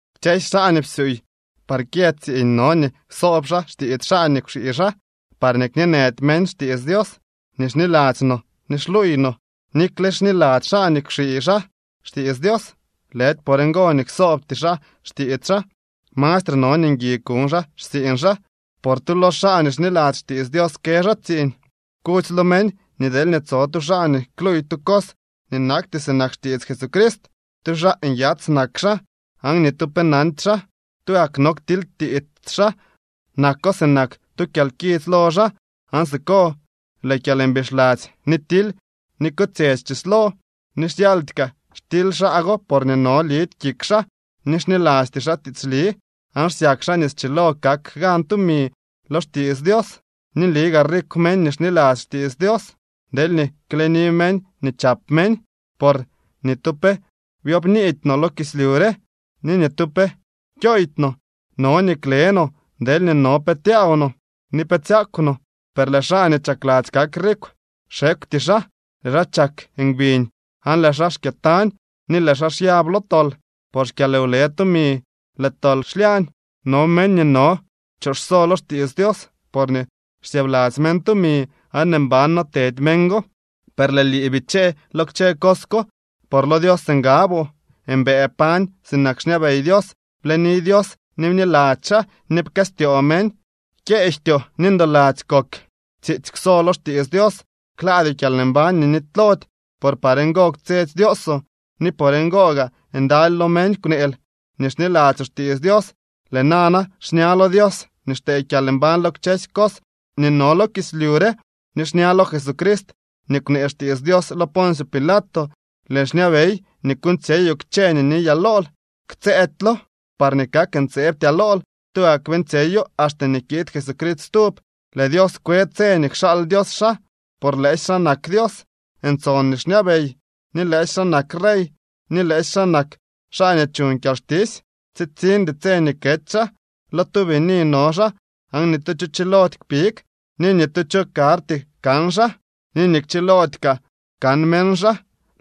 Kchësy xaa nii psyuuy par kyë tsiiñ no nii ksoob xaa xtiits xaa nii kwxii xaa, parñee kñeenëdy meñ xtiits Dios nii xniladzy no ni xluuy no. Nikle xniladzy xaa nii kwxii xaa xtiits Dios, lëdy por ngo nii ksoobty xaa xtiits xaa. Mastre no nii ngui kuñ xaa xtsiiñ xaa, por tu lo xaa nii xniladzy xtiits Dios kë xaa tsiiñ. Kudzy lo meñ nii deelñee tso tu xaa nii kluuy tu cos nii nakty sinak xtiits Jesucrist tu xaa nyats nak xaa aan ni tu pe nandy xaa. Tugak no ktilytiits xaa nako sinak tu kyalkits lo xaa. Aan siko lëë kyalmbixladzy, ni tily, ni kotsyetsy chislo. Ni xyaldy kaa xtily xaa go porñee no lidy kik xaa ni xnilasty xaa tiitsli, aan xsyak xaa nii schilo kak gan tumi lo xtiits Dios. Ni nli gaa rikw meñ nii xniladzy xtiits Dios deelñee kleni meñ nii chap meñ. Por ni tu pe byobniidy no lo kislyu re, ni ni tu pe kyooydy no. No nii kle no deelñee no pe tyaaw no ni pe tsyakw no. Per lëë xaa nii chakladzy kak rikw xekwty xaa. Lëë xaa chak ngbiñ aan lëë xaa xkyëtañ ni lëë xaa xyab lo tol. Por xkyalwlë tumi lëë tol xlyañ. No meñ nii no kchoxso lo xtiits Dios porñee xsyëëbladzy meñ tumi aan mban no tedy meñ go. Per lëë lii, bichee lo kchë cos ko por lo Dios ngaboo. Mbëë pañ sinak xñabey Dios, bleni Dios, ni bniladzy xaa, ni pkëstyoo meñ, kyeejtyoo ni ndoladzy kok. Tsiitsy kwso lo xtiits Dios. Klaadyoo kyalmbañ nii nitylody, por par ngo kwtsyetsy Dioosoo ni por ngo gaa ndaly lo meñ kwneel nii xniladzyoo xtiits Dios. Lëë nana, xña lo Dios nii xtee kyalmbañ lo kchësy cos nii no lo kislyu re, ni xña lo Jesucrist nii kwnee xtiits Dios lo Poncio Pilato, lëën xñabey nii kuuñtsyeyoo kchë nii niyaa lool, ktsëëdylo, parñee kak ntseebtyaa lool. Tugak beeñtsyeyo axte nii kiid Jesucrist stub. Lëë Dios kwe tse nii kxaal Dios xaa, por lëësy xaa nak Dios ntson nii xñabey, ni lëësy xaa nak rey, ni lëësy xaa nak xaa nii chuñ kyalxtisy. Tsitsiñdy tse nii kety xaa, lo tu bini no xaa aan ni tu cho chilody kpig, ni ni tu cho karty kan xaa ni kchilody kaa kan meñ xaa.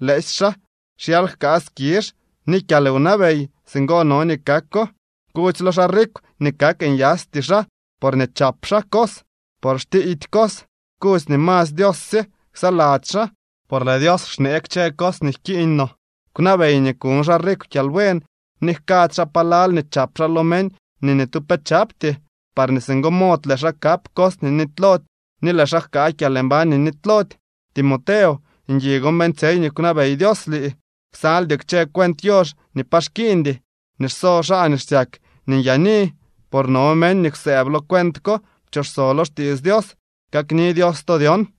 ¡Lëësy xaa xyal jkaa skizh ni kyalwnabey! Singo no nii kako. Kudzy lo xaa rikw nii kak nyaasty xaa porñee chap xaa cos, por xtiiydy cos. Kudzy nii masy Dios sye ksaladzy xaa por lëë Dios xnee kchë cos nii jkiiñ no. Kwnabey nii kuñ xaa rikw kyalbuen ni jkady xaa palal nii chap xaa lo meñ nii ni tu pe chapty. Parñee singo mod lëë xaa kap cos nii nitylody ni lëë xaa jkaa kyalmbañ nii nitylody. Timoteo, ngui gon beeñtsyey nii kwnabey Dios lii, ksaldyoo kchë cuent yox nii pa xkiiñdy nii xso xaa nii xsyak nii nyaani. Por no meñ nii kwsëëb lo cuent ko pchoxso lo xtiits Dios. Kakni Dios to dyon.